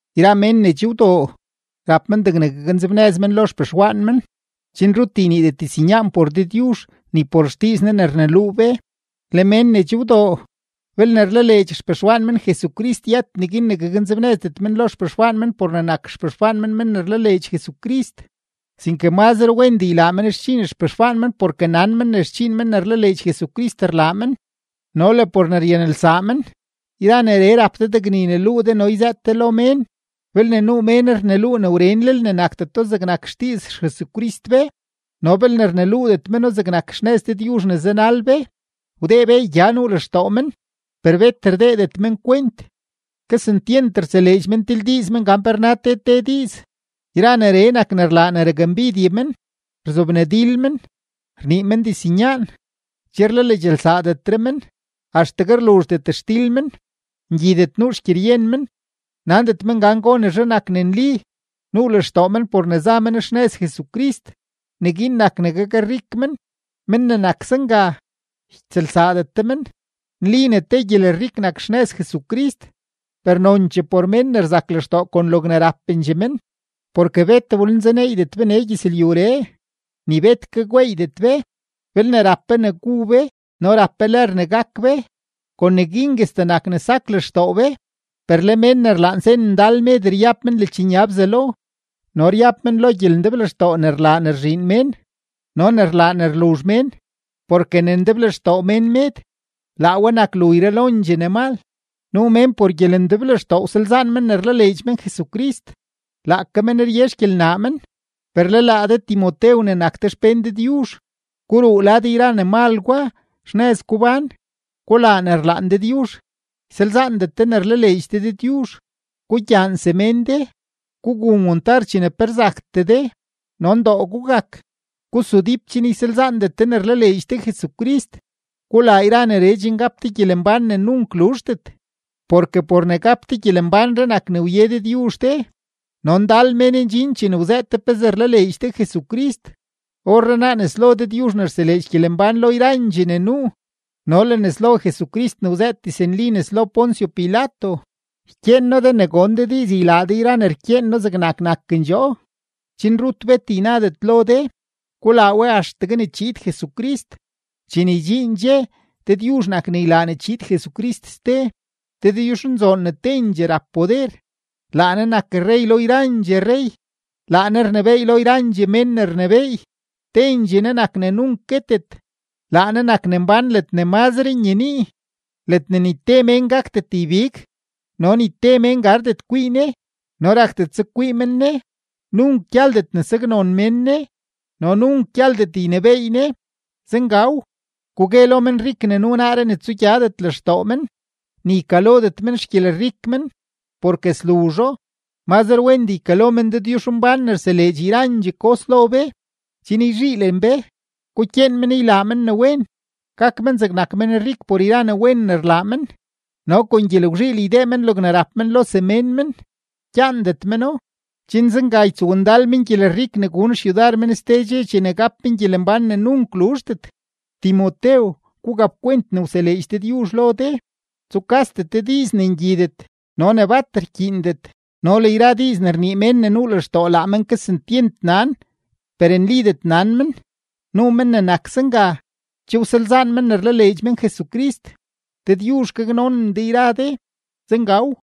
Yra mén ne che wdoo, rap men degne gaknzebnëz men lo xpexwaan men, chen rut yniidet diznyaan por Dëdyuzh ni por xdiiz Ne ne rneluu be. Le mén ne che wdoo, belne rlaleedx xpexwaan men Jesucrist yët neguin ne gaknzebnëzdet men lo xpexwaan men por ne nak xpexwaan men men ne rlaleedx Jesucrist, sinke mazre wendee ylaa men xdxiin xpexwaan men porke nan men ne xdxiin men ne rlaleedx Jesucrist rlaa men no le por ne ryanelsaa men. Yra neree rap de degne yneluu de no yzëët de lo mén. Belne nuu mén rneluu ne wrenlel ne nakdeto zegnak xdiiz XJesucrist be no belne rneluudet meno zegnak xnëz Dëdyuzh ne zanal be, wdee beey gya nuu lextoo men, per bet rdeedet men kwent. Kesentyent rtseleedx men tildiiz men gan pe rna te te diiz; yra neree nak ne rlaa ne rakmbidye men, rzobnadil men, rnii men diznyaan, che rlaleedxelsaadetre men, axtegue rluzhdet xdil men, ngyidet nuu xgyeryen men, nandet men gan gonezhe nak ne nli; nuu lextoo men por ne za men xnëz Jesucrist, neguin nak ne gakrik men. Men ne nak zenga, ytsëlsaadet de men. Nli ne te gyelrik nak xnëz Jesucrist, per nonchee por mén ne rzak lextoo kon logne rapendxee men. Porke bet wlenzaneeydet be nee gyëzlyuree, ni bet ke gweeydet be. Belne rap be ne gu be no rap be lër ne gak be, kon neguinguestee nak ne sak lextoo be. Per le mén ne rlaan sen ndal med ryab men ledxnya Bzelo no ryab men lo gyelendeblextoo ne rlaa ne rzhiin mén no ne rlaa ne luzh mén. Porke ne ndeblextoo mén med, laa we nak lu yralondxee ne mal. Nuu mén por gyelendeblextoo wsalzaan men ne rlaleedx men Jesucrist; laake men rye xgyelnaa men. Per le laa de Timotew ne nak de xpén Dëdyuzh, guruu lad yra ne mal gwa, xnëz gubán, gulaa ne rlaan Dëdyuzh, ysalzaandet ne rlaleedx de Dëdyuzh, gugyaan semén de, gugun wantar chene pe rzaktee de, no ndoo gugak. Gusudíp chen ysalzaandet de ne rlaleedx de Jesucrist. Gulaa yra neree chen gap de gyelembán ne nunk luzhdet, porke por ne gap de gyelembánree nak ne wye Dëdyuzh de, no ndal mén ndxin chene wzëët de pezee rlaleedx de Jesucrist. Orrenaa nes lo Dëdyuzh ne rseleedx gyelembán lo yrandxee ne nuu no le nes lo Jesucrist ne wzëët diznli nes lo Poncio Pilato, ykyeen noo de ne gon de diiz ylaa de yra ne rkyeen noo zegnak nakendxoo, chen rut bet ynadet lo de; gulaa we axtegue ne chiid Jesucrist. Chene ydxiin dxe, Dëdyuzh nak ne ylaa ne chiid Jesucrist ste; Dëdyuzhnzoon ne tendxee rap poder, laa Ne nak rrey lo yrandxee rrey, laa Ne rnebééy lo yrandxee mén ne rnebééy, tendxee Ne nak ne nunk guetet; laa Ne nak ne mbán ledne mazre nyenii, ledne ni te mén gakdet ybig, no ni te mén gardet kwii Ne no rakdet zeg kwii men Ne. Nunk gyaldet ne saknon mén Ne no nunk gyaldet ynebééy Ne. Zengaw. Gugue lo menrik ne nuu naaree ne tsugyadet lextoo men, ni ykalodet men xgyelrik men, porke sluzho. Mazre wendee ykalo men Dëdyuzhmbán ne rseleedx yra yrandxee kos lo be chen yzhiilen be. Gukyeen men ylaa men ne wen, gak men zegnak menrik por yra ne wen ne rlaa men, no kon gyelgwzhiil ydee men logne rap men lo semén men, gyaandet meno, chen zenga ytsowndal men gyelrik ne gun xyudar men ste dxe chene gap men gyelembán ne nunk luzhdet. Timotew, gugapkwent ne wseleedx Dëdyuzh lo de. Tsukasdet de diiz ne ngyidet no ne bat rkyiindet no le yra diiz ne rnii mén ne nuu lextoo laa men kesentyent nan per nlidet nan men. Nuu men ne nak zenga, che wsalzaan men ne rlaleedx men Jesucrist. Dëdyuzh gaknonen de yra de. Zengaw.